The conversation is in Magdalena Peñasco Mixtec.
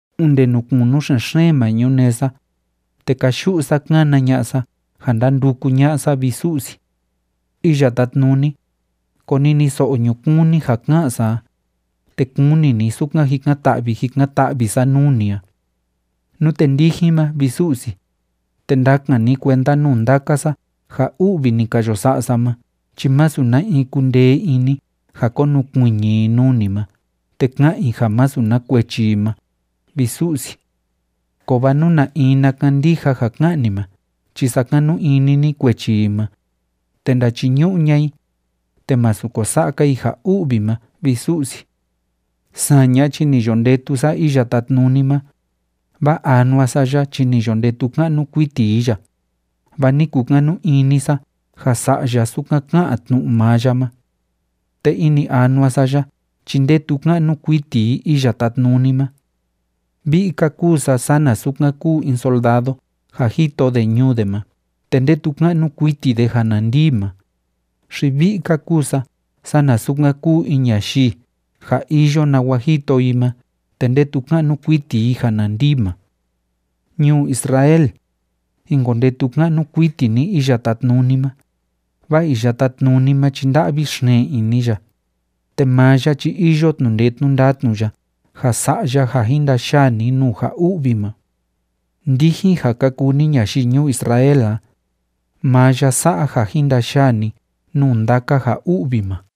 Onde nuu kunu xen‑xeen ma ñunee sa, te káyu'u sa kána ña'a sa ja ndánduku ña'a sa, vi Su'si. Iya Tátnuni, koniniso'o ñukuun ni ja ká'an sa a, te kuni ni sukan jikan‑ta'vi jikan‑ta'vi sa nuu ni a. Nute ndijin ma, vi Su'si, te ndakan ni kuenda nuu ndaka sa ja u'vi ni ka yo sa'a sa ma chi masu na in kundee ini ja konukuiñi i nuu ni ma te ka'an i ja masu na kuechi i ma, vi Su'si. Kovaa nú na in na kandija ja ká'an ni ma chi sakanu ini ni kuechi i ma, te ndachiñu'u ña'a i, te masu ko sa'a‑ka i ja u'vi ma, vi Su'si. Saña chi ni yo ndetu sa Iya Tátnuni ma, vaa anua sa ya chi ni yo ndetu ka'nu kuiti i ya, vaa ni kukanu ini sa ja sa'a ya sukan ká'an tnu'u maa ya ma. Te ini anua sa ya chi ndetu ka'nu kuiti i Iya Tátnuni ma. Vi'i‑ka kúu sa sana sukan kúu in soldado ja jito de ñuu de ma te ndetu ka'nu kuiti de ja na ndii ma, xi vi'i‑ka kúu sa sana sukan kúu in ñayii ja iyo nawa jito i ma te ndetu ka'nu kuiti i ja na ndii ma. Ñuu Israel, jin kondetu ka'nu kuiti ni Iya Tátnuni ma, vaa Iya Tátnuni ma chi nda'vi xeen ini ya, te maa ya chi iyo tnu'u ndee tnu'u ndatnu ya ja sa'a ya ja jin ndayaa ni nuu ja u'vi ma. Ndijin ja ka kuu ni ñayii ñuu Israel a, maa ya sa'a ja jin ndayaa ni nuu ndaka ja u'vi ma.